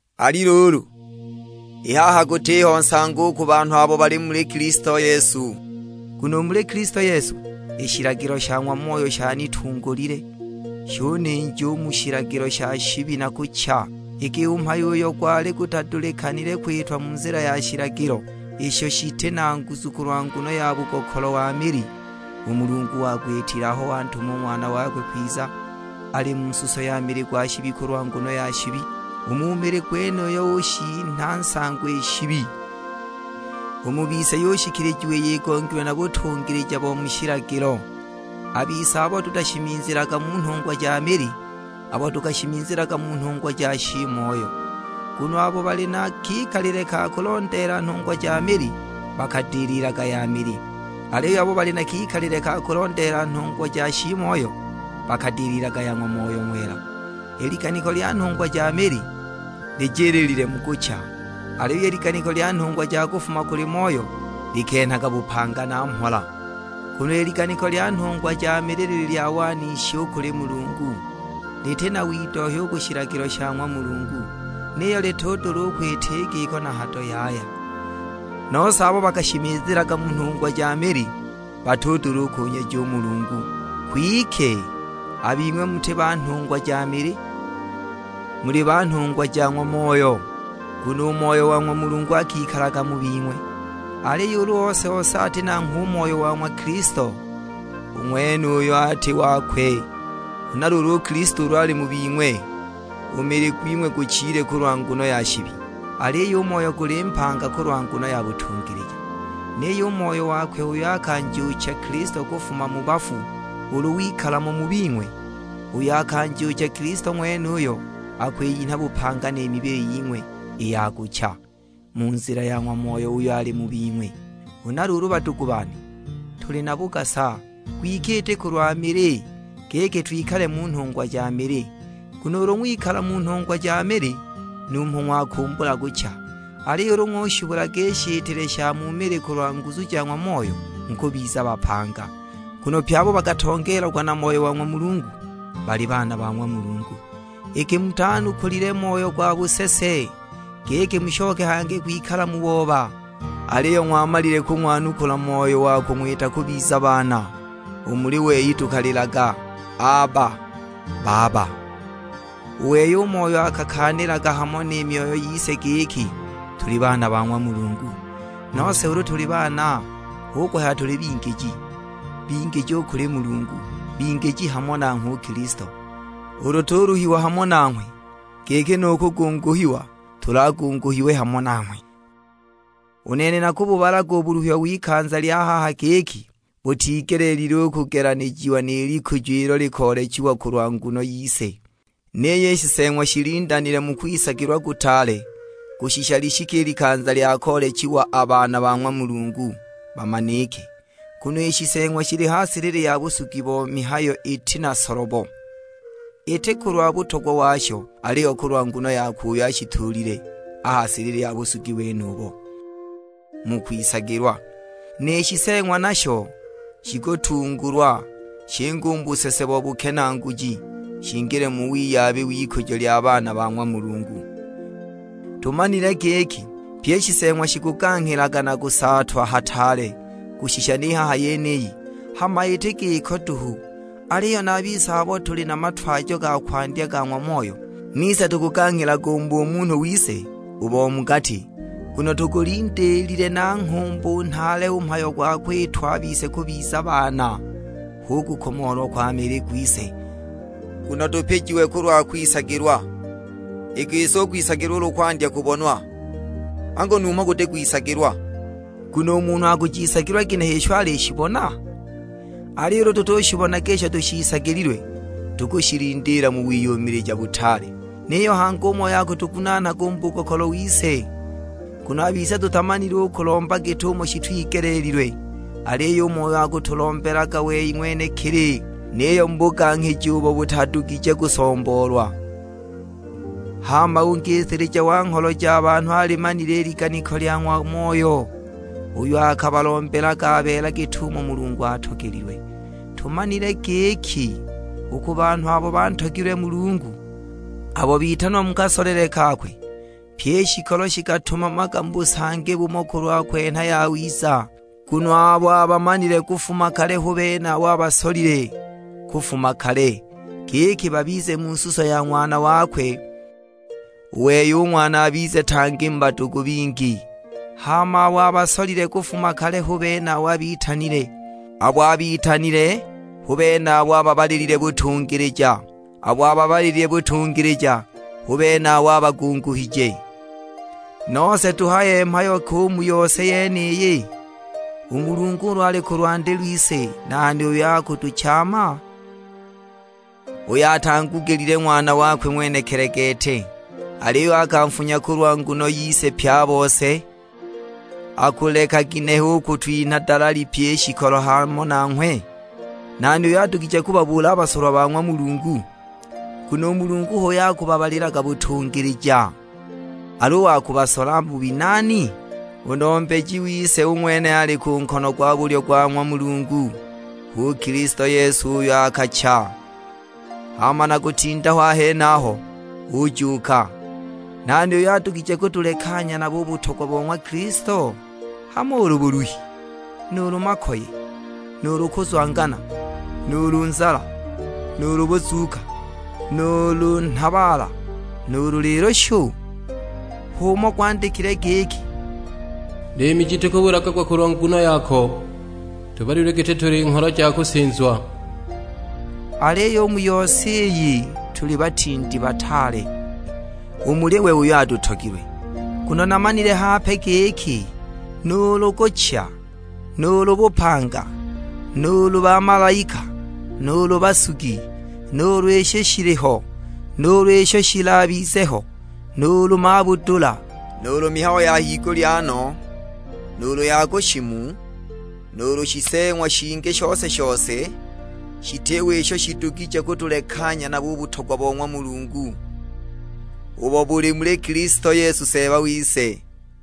Ali luulu, i haha gutiho nsango u ku banhu abo bali muli Kilisto Yesu. Nguno u muli Kilisto Yesu, i shilagilo sha ng'wa Moyo shanitungulile, shuninja u mu shilagilo sha shibi na kucha. Iki u mhayo uyo gwali gutadulikanile kwitwa mu nzila ya shilagilo, isho shiti na nguzu kulwa nguno ya bugokolo wa mili, u Mulungu wagwitile aho wantuma u Ng'wana wakwe kwiza, ali mu suso ya mili gwa shibi kulwa nguno ya shibi; u mu mili gwenuyo ushinha nsango i shibi. U mu bise yushikilijiwa iyo igongilwe na butungilija bo mu shilagilo, a bise abo tutashimizilaga mu nhungwa ja mili, abo tukashimizilaga mu nhungwa ja shiimoyo. Nguno abo bali na kikalile ka kulondeela nhungwa ja mili, bakadililaga ya mili. Aliyo abo bali na kikalile ka kulondeela nhungwa ja shiimoyo, bakadililaga ya ng'wa Moyo Ng'wela. I liganiko lya nhungwa ja mili, lijiliilile mu kucha, aliyo i liganiko lya nhungwa ja kufuma kuli Moyo likenhaga bupanga na mhola. Nguno i liganiko lya nhungwa ja mili lili lya wanishi u kuli Mulungu, liti na widohya u ku shilagilo sha ng'wa Mulungu; niyo litudula u kwita i giko na hado yaya! Nose abo bakashimizilaga mu nhungwa ja mili batudula u kunyeja u Mulungu. Kwike a bing'we muti ba nhungwa ja mili, muli ba nhungwa ja ng'wa Moyo, nguno u Moyo wa ng'wa Mulungu akikalaga mu bing'we. Aliyo ulu ose-ose ati nanghwe u Moyo wa ng'wa Kilisto, u ng'wenuyo ati wakwe. Huna luulu u Kilisto ulu ali mu bing'we, u mili gwing'we guchile kulwa nguno ya shibi, aliyo u moyo guli mpanga kulwa nguno ya butungilija. Niyo u Moyo wakwe uyo akanjuucha Kilisto kufuma mu bafu ulu wikala mo u mu bing'we, uyo akanjuucha Kilisto ng'wenuyo akwiyinha bupanga ni mibili ying'we i ya kucha, mu nzila ya ng'wa Moyo uyo ali mu bing'we. Huna luulu badugu bane, tuli na bugasa, gwike iti kulwa mili, giki twikale mu nhungwa ja mili. Nguno ulu ng'wikala mu nhungwa ja mili numho ng'wakumbula kucha, aliyo ulu ng'ushibulaga i shitile sha mu mili kulwa nguzu ja ng'wa Moyo, mukubiza bapanga. Nguno pye abo bakatongeelagwa na Moyo wa ng'wa Mulungu, bali baana ba ng'wa Mulungu. Iki mutanukulile moyo gwa busese, giki mushoke hangi kwikala mu booba; aliyo ng'wamalile kung'wanukula Moyo wa kung'wita kubiza baana; u muli wei tukalilaga "Aba," Baba. U wei u Moyo akakaanilaga hamo ni myoyo yise giki tuli baana ba ng'wa Mulungu. Nose ulu tuli baana, hu kuhaya tuli bingiji, bingiji u kuli Mulungu, bingiji hamo nanghwe u Kilisto; ulu tuluhiwa hamo nanghwe, giki nu kugunguhiwa tulagunguhiwe hamo nanghwe. U nene nakububalaga u buluhi w'ikanza lya haha giki butigelile u kugelanijiwa ni likujo ilo likoolechiwa kulwa nguno yise. Niyo i shiseeng'wa shilindanile mu kwisagilwa kutaale kushisha lishike i likanza lya koolechiwa a baana ba ng'wa Mulungu, bamanike. Nguno i shiseeng'wa shili ha silili ya busugi bo mihayo iti na solobo, iti kulwa butogwa washo, aliyo kulwa nguno yakwe uyo ashituulile a ha silili ya busugi wenubo, mu kwisagilwa. Ni shiseeng'wa nasho shikutungulwa, shinge u mu busese wa bukenaaguki, shingile mu wiyabi w'ikujo lya baana ba ng'wa Mulungu. Tumanile giki pyi i shiseeng'wa shikuganghilaga na kusaatwa hataale kushisha ni haha yeniyi! Hama iti giko duhu, aliyo na a bise abo tuli na matwajo ga kwandya ga ng'wa Moyo, nise tukuganghilaga u mu bumunhu wise u bo mu gati, nguno tugulindiilile na nghumbu nhaale u mhayo gwa kwitwa a bise kubiza baana, hu kukomoolwa kwa mili gwise. Nguno tupijiwe kulwa kwisagilwa; i gisi u kwisagilwa ulu kwandya kubonwa, angu numho kuti kwisagilwa, nguno u munhu akushiisagilwa ginehe isho alishibona? Aliyo ulu tutushibonaga isho tushiisagililwe, tukushilindiila mu wiyumilija butaale. Niyo hangi u Moyo akatugunaanaga u mu bugokolo wise, nguno a bise tutamanile u kulomba git'umo shitwigeleelilwe, aliyo u Moyo akatulombelaga wei ng'wenekili, niyo mu buganghiji ubo butadugije kusomboolwa. Hama u Ngisilija wa ngholo ja banhu alimanile i liganiko lya ng'wa Moyo, uyo akabalombelaga a beela git'umo Mulungu atogelilwe. Tumanile giki, u ku banhu abo bantogilwe Mulungu, abo bitanwa mu kasolele kakwe, pyi i shikolo shikatumamaga mu busangi bumo kulwa kwenha yawiza. Nguno abo abamanile kufuma kale hu bene abo abasolile kufuma kale, giki babize mu suso ya Ng'wana wakwe; u wei u Ng'wana abize tang@i mu badugu bingi. Hama abo abasolile kufuma kale hu bene abo abitanile; abo abitanile hu bene abo ababalilile butungilija, abo ababalilile butungilija hu bene abo abagunguhije. Nose tuhaye mhayo ki u mu yose yeniyi? U Mulungu ulu ali ku lwandi lwise, nani uyo akutuchaama? Uyo atangugilile Ng'wana wakwe ng'wenekili gete, aliyo akanfunya kulwa nguno yise pye a bose, akuleka ginehe u kutwinha dalali pyi i shikolo hamo nanghwe? Nani uyo adugije kubabuula a basolwa ba ng'wa Mulungu? Nguno u Mulungu h'uyo akubabalilaga butungilija! Al'u wa kubasola bubi nani? U Nombeji wise u ng'wene ali ku nkono gwa bulyo gwa ng'wa Mulungu; h'u Kilisto Yesu uyo akacha, hama na kutinda ho a henaho, ujuuka! Nani uyo adugije kutulekanya nabo u butogwa bo ng'wa Kilisto? Hamo ulu buluhi, nuulu makoye, nuulu kuzwangana, nuulu nzala, nuulu buzuuka, nuulu nhabaala, nuulu lilushu? H'umo gwandikililwe; giki, "Liimi ji tukubulagagwa kulwa nguno yako, tubalilwe giti tuli ngholo ja kusinzwa!" Aliyo u mu yose iyi tuli batindi bataale, u muli we uyo atutogilwe. Nguno namanile hape giki, nuulu kucha, nuulu bupanga, nuulu bamalaika, nuulu basugi, nuulu isho shiliho, nuulu isho shilabize ho, nuulu mabudula; nuulu mihayo ya higulya no, nuulu ya ku shimu, nuulu shiseeng'wa shingi shose-shose: shitiho isho shidugije kutulekanya nabo u butogwa bo ng'wa Mulungu, ubo buli muli Kilisto Yesu Seeba wise.